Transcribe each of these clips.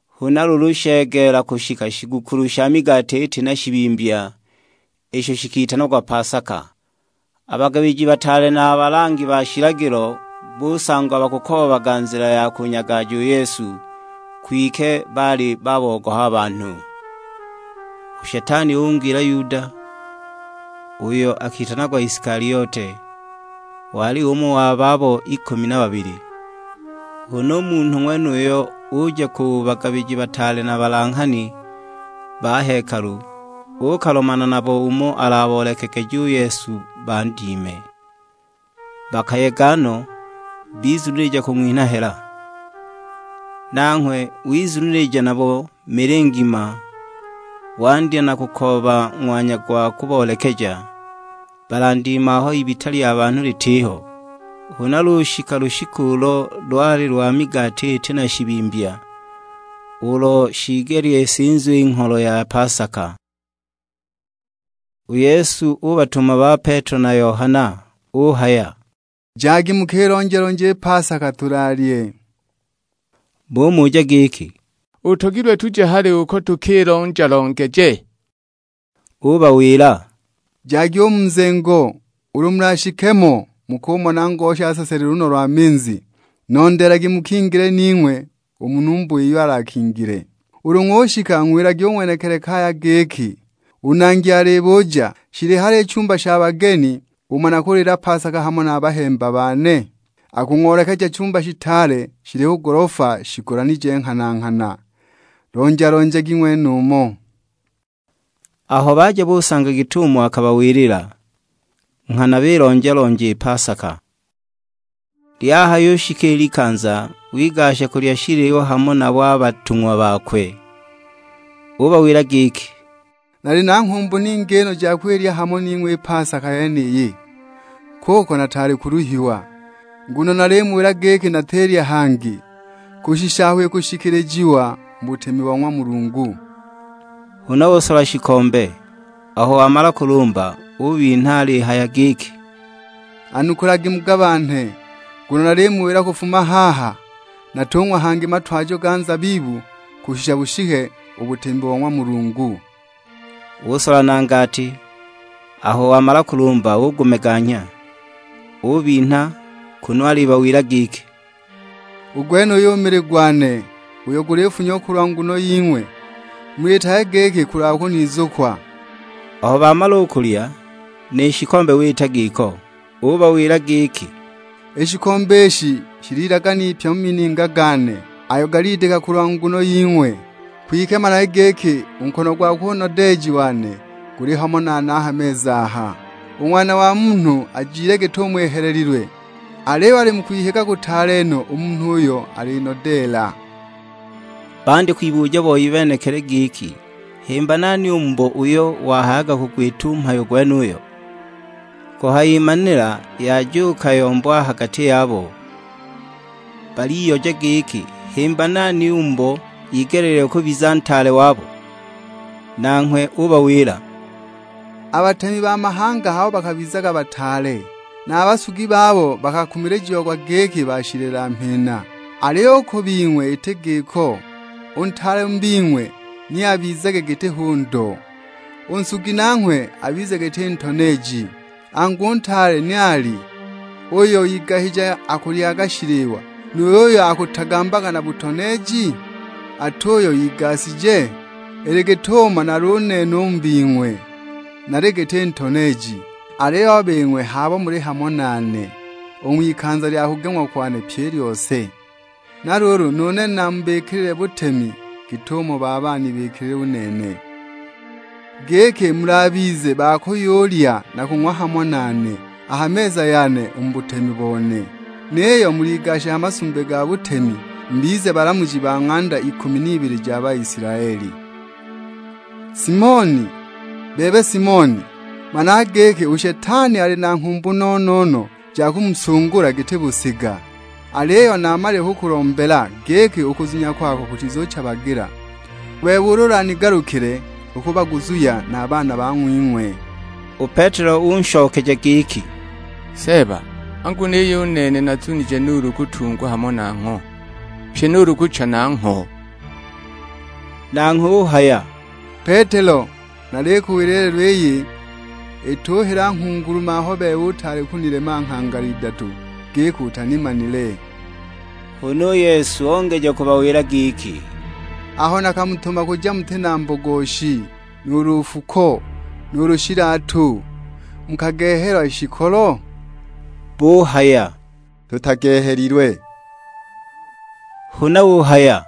Huna luulu shegeela kushika shigukulu sha migati iti na shibimbya, isho shikitanagwa pasaka. A bagabiji bataale na a balangi ba shilagilo busangwa bakukoobaga nzila ya kunyagaja u Yesu; kwike baali babogoha a banhu. U Shetani ung'wingila Yuda, uyo witanagwa Isikaliote; wali umo wa babo ikumi na babili. Huna u munhu ng'wenuyo uja ku bagabiji bataale na balanghani ba hekalu, uukalomana nabo umo alaboolekegeje u Yesu bandime. Bakayega no, bizunilija kung'winha hela. Nanghwe wizunilija nabo mili ngima; wandya na kukooba ng'wanya gwa kuboolekeja, balandime aho ibita lya banhu litiho. Huna lushika lushiku ulo lwali lwa migati iti na shibimbya; ulo shiigelile isinzwe i ngholo ya pasaka. U Yesu ubatuma ba Petelo na Yohana; uhaya, "Jagi mukilonja-lonje i pasaka tulaalye." Bumuja giki, "Utogilwe tuje hali uko tukilonja-longeje?" Ubawila, "Jagi u mu nzengo, ulu mulashike mo mukumona ngosha aseselile lunno lwa minzi; nondeelagi mukingile ning'we u mu numba iyo alakingile. Ulu ng'ushika ng'wilagi u ng'wenekili kaya giki, 'U Nangi alibuja: Shili hali i chumba sha bageni umo nakuliila pasaka hamo na bahemba bane?' Akung'oolekeja chumba shitaale shili ku golofa shigolanije nghana-nghana, lonja-lonjagi ng'wenumo." Aho baja busanga git'umo akabawilila, nghana bilonja-lonja i pasaka. Lyahayushika i likanza, wigasha kulya shiliwa hamo nabo a batung'wa bakwe. Ubawila giki, "Naali na nghumbu ningi no ja kwilya hamo ning'we i pasaka yeniyi, kuko nataali kuluhiwa. Nguno nalimuwila giki natilya hangi, kushisha aho ikushikilijiwa mu butemi bo ng'wa Mulungu." Huna usola shikombe; aho wamala kulumba, ubinha alihaya giki, "Anukulagi mugabanhe, nguno nalimuwila kufuma haha, natung'wa hangi matwajo ga nzabibu kushisha bushike u butemi bo ng'wa Mulungu." Usola na ngati, aho wamala kulumba ugumeganya; ubinha kunu alibawila giki, "U gwenuyu mili gwane, uyo gulifunyiwa kulwa nguno ying'we, muliitage giki kulwa kunizukwa." Aho bamala u kulya, ni shikombe wita giko; ubawila giki, "I shikombe ishi shili ilagane ipya mu mininga gane, ayo galidika kulwa nguno ying'we. Kwike managi giki, u nkono gwakwe u nodeeji wane guli hamo nane a ha meza aha! U Ng'wana wa Munhu ajile git'umo ihelelilwe, aliyo ali mu kwihiga kutaale no u munhu uyo alinodeela!" Bandya kwibuja boi benekili giki himba nani u mubo uyo wahayaga kugwita u mhayo gwenuyo! Kuhayimanila yajuuka yombo a ha gati yabo; baliyoja giki himba nani u mubo igeleelilwe kubiza ntaale wabo. Nanghwe ubawila, "A batemi ba mahanga h'abo bakabizaga bataale; na a basugi babo bakakumilijiagwa giki bashilela-mhina. Aliyo u ku bing'we iti giko, u ntaale mu bing'we ni abizage giti hu ndo, u nsugi nanghwe abize giti ntoneeji. Angu u ntaale ni ali; uyo igashije akulyaga shiliwa, nuulu uyo akutagambaga na butoneeji? Ati uyo igashije? Ili git'umo nali u nene u mu bing'we; nali giti ntoneeji! Aliyo a bing'we h'abo muli hamo nane u ng'wikanza lya kugeng'wa kwane pyi i lyose. Na luulu nu nene namubikilile butemi git'umo Baba anibikilile u nene; giki mulabize ba kuyulya na kung'wa hamo nane a ha meza yane u mu butemi bone. Niyo muligashe ha masumbi ga butemi, mubize balamuji ba ng'anda ikumi n'ibili ja Baisilaeli." "Simoni, bebe Simoni, managa giki u Shetani ali na nghumbu no-no-no ja kumusungula giti busiga. Aliyo naamalile kukulombela, giki u kuzunya kwako kutizuchabagila. U bebe ulu ulanigalukile, ukubaguzuhya na a baana bang'wing'we!" U Petelo unshokeja giki, "Seeba, angu niyo u nene nazunije nuulu kutungwa hamo nangho, pyi nuulu kucha nangho!" Nanghwe uhaya, "Petelo, nalikuwila i lelo iyi ituhila nghungulume aho u bebe utaali kunilema nghangala idatu giki utanimanile." Huna u Yesu ongeja kubawila giki, "Aho nakamutuma kuja muti na mbogoshi, nuulu nfuko, nuulu shilatu, mukagehelwa shikolo?" Buhaya, "Tutagehelilwe." Huna uhaya,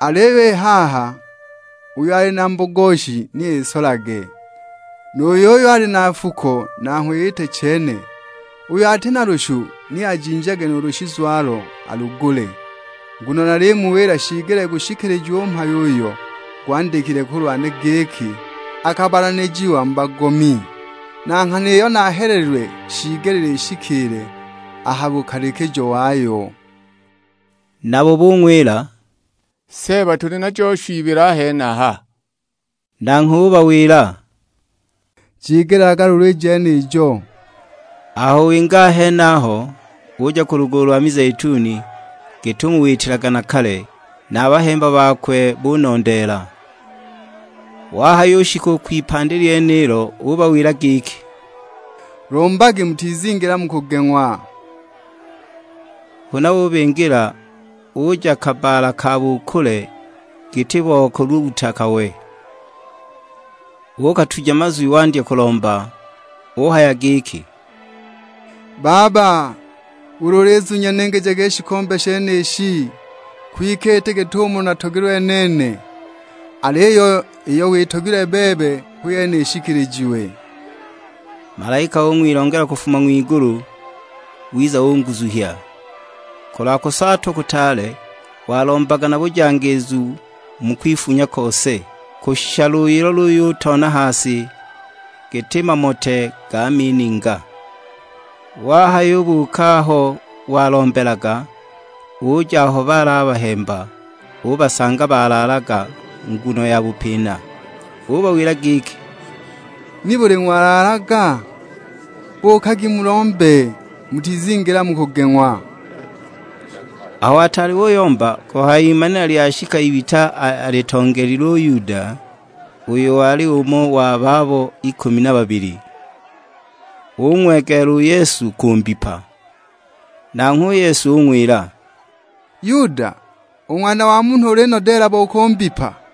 "Aliyo i haha, uyo ali na mbogoshi ni isolage, nu yuyo ali na nfuko nanghwe iite chene; uyo ati na lushu ni ajinjage nuulu shizwalo alugule. Nguno nalimuwila shiigelile gushikilijiwe u mhayo uyo gwandikilwe kulwane; giki, 'Akabalanijiwa mu bagomi'. Na nghana iyo nahelelilwe shiigelile ishikiile a ha bukalikijo wayo!" Nabo bung'wila, "Seeba tuli najo shu ibili a henaha." Nanghwe ubawila, "Jigelaga luulu i jenijo." Aho winga a henaho, uja ku lugulu lo mizeituni, git'umo witilaga na kale; na a bahemba bakwe bunondeela. Wahayushika u kwipandi lyenilo ubawila giki, "Lombagi mutizingila mu kugeng'wa." Huna ubingila, uja kabbaala ka bu kule giti bo kuluuta kawe. Uukatuja mazwi wandya kulomba; Uhaya giki, "Baba, ulu ulizunya ningijage i shikombe shenishi! Kwike iti git'umo natogelilwe nene, aliyo iyo witogilwe bebe hu yene ishikilijiwe." [ Malaika ung'wilongela kufuma ng'wigulu, wiza unguzuhya. Kulwa kusaatwa kutaale, walombaga na bujangiizu mu kwifunya kose; kushisha luyilo luyutoona ha si, giti mamote ga mininga!] Wahayubuuka aho walombelaga, uja aho baali a bahemba, ubasanga balaalaga, nguno ya bupina. Ubawila giki, "Nibuli ng'walaalaga? Buukagi mulombe, mutizingila mu kugeng'wa!" Aho ataali uyomba, kuhayimanila lyashika ibita alitongeelile u Yuda, uyo wali umo wa babo ikumi na babili. Ung'wegeela u Yesu kumbipa! Nanghwe u Yesu ung'wila, "Yuda, u Ng'wana wa Munhu ulinodeela bo kumbipa?"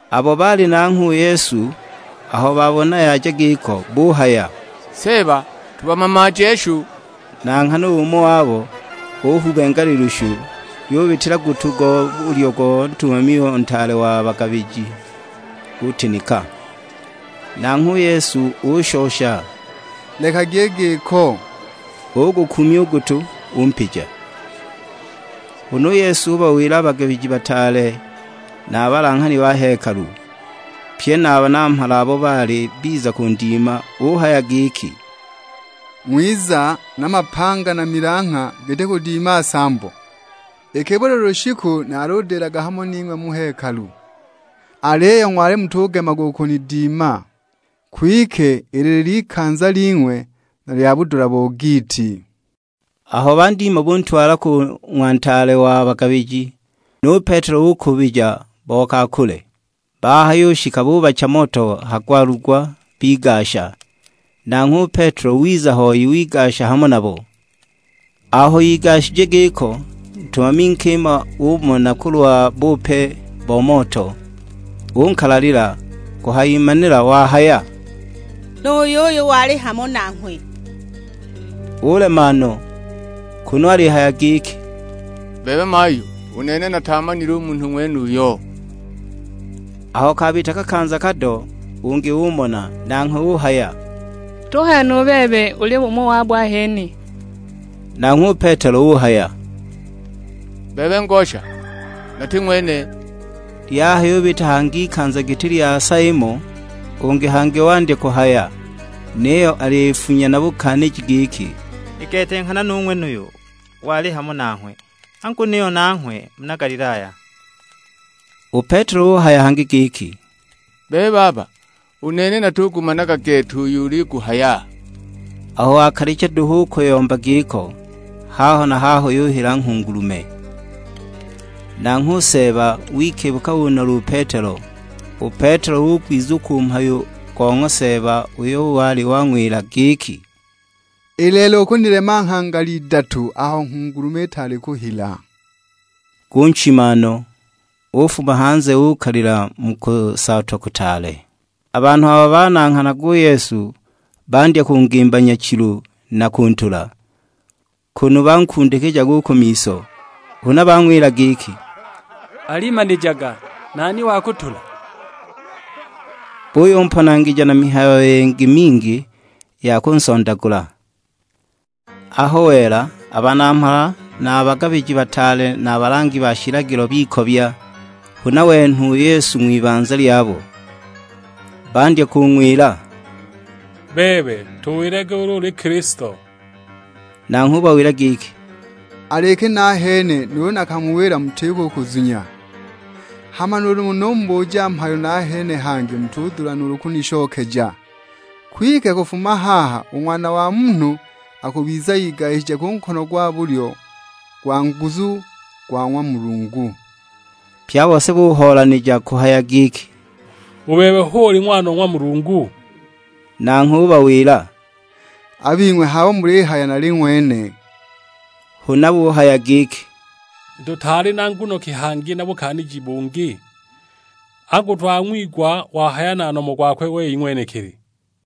Abo baali nanghwe u Yesu aho babona yaja giko; buhaya, "Seeba tubamamaaje shu!" Na nghana umo wabo uhubenga lilushu, lyubitila gutu go bulyo go ntumami o ntaale wa bagabiji; gutinika! Nanghwe u Yesu ushosha, "Lekagi i giko." Ugukuumya u gutu, umpija. Huna u Yesu ubawila a bagabiji bataale na a balanghani ba hekalu, pye na a banamhala abo baali biza kundima; uhaya giki, "Ng'wiza na mapanga na milangha giti kudima nsambo! Iki buli lushiku naludilaga hamo ning'we mu hekalu, aliyo ng'wali mutugemaga u kunidima. Kwike ili lili ikanza ling'we na lya budula bo giiti!" Aho bandima buntwala ku ng'wa ntaale wa bagabiji; nu Petelo ukuubija bo ka kule. Bahayushika bubacha moto ha gwalugwa bigasha; nanghwe u Petelo wiza hoi wigasha hamo nabo. Aho igashije giko, ntumami nkima umona kulwa bupe bo moto, unkalalila; kuhayimanila wahaya, "Nu yuyu wali hamo nanghwe!" Ulema no; kunu alihaya giki, "Bebe mayu, u nene nataamanile u munhu ng'wenuyo!" Aho kabita kakanza kado ungi umona; nanghwe uhaya, "Tuhaya nu bebe uli umo wabo ahene!" Nanghwe u Petelo uhaya, "Bebe ngosha, nati ng'wene!" Lyahayubita hangi ikanza giti lya sa imo, ungi hangi wandya kuhaya, niyo alifunya na bukaaniji giki, "I gete nghana nu ng'wenuyu wali hamo nanghwe, angu niyo nanghwe muna Galilaya!" U Petelo uhaya hangi giki, "Bebe baba, u nene natugumanaga gete uyo uliguhaya!" Aho wakalicha duhu u kuyomba giko, haho na haho yuhila nghungulume. Nanghwe u Seeba wikibuka unola u Petelo; u Petelo ugwizukwa u mhayo go ng'wa Seeba uyo wali wang'wila giki, "I lelo ukunilema nghangala idatu aho nghungulume itaali kuhila!" Gunchima no, ufuma hanze uukalila mu kusaatwa kutaale! A banhu abo bananghanaga u Yesu bandya kungimba nyachilu na kuntula, kunu bankundikijaga u ku miso; huna bang'wila giki, "Alimanijaga, nani wakutula!" Buyumponangija na mihayo yingi mingi ya kunsondagula! Aho wela, a banamhala na a bagabiji bataale na a balangi ba shilagilo bikobya, huna wenhwa u Yesu ng'wibanza lyabo. Bandya kung'wila, "Bebe, tuwilage ulu uli Kilisto;" nanghwe ubawila giki, "Al'iki nahene nuulu nakamuwila mutiko u kuzunya. Hama nuulu numubuja mhayo nahene hangi mutudula nuulu kunishokeja. Kwike kufuma haha u Ng'wana wa Munhu akubiza igashije ku nkono gwa bulyo gwa nguzu, gwa ng'wa Mulungu." Pye a bose buhoolanija kuhaya giki, "U bebe hu uli Ng'wana wa ng'wa Mulungu?" Nanghwe ubawila, "A bing'we h'abo mulihaya nali ng'wene." Huna buhaya giki, "Tutaali na nguno ki hangi na bukaaniji bungi? Angu twang'wigwa wahaya na nomo gwakwe wei ng'wenekili!"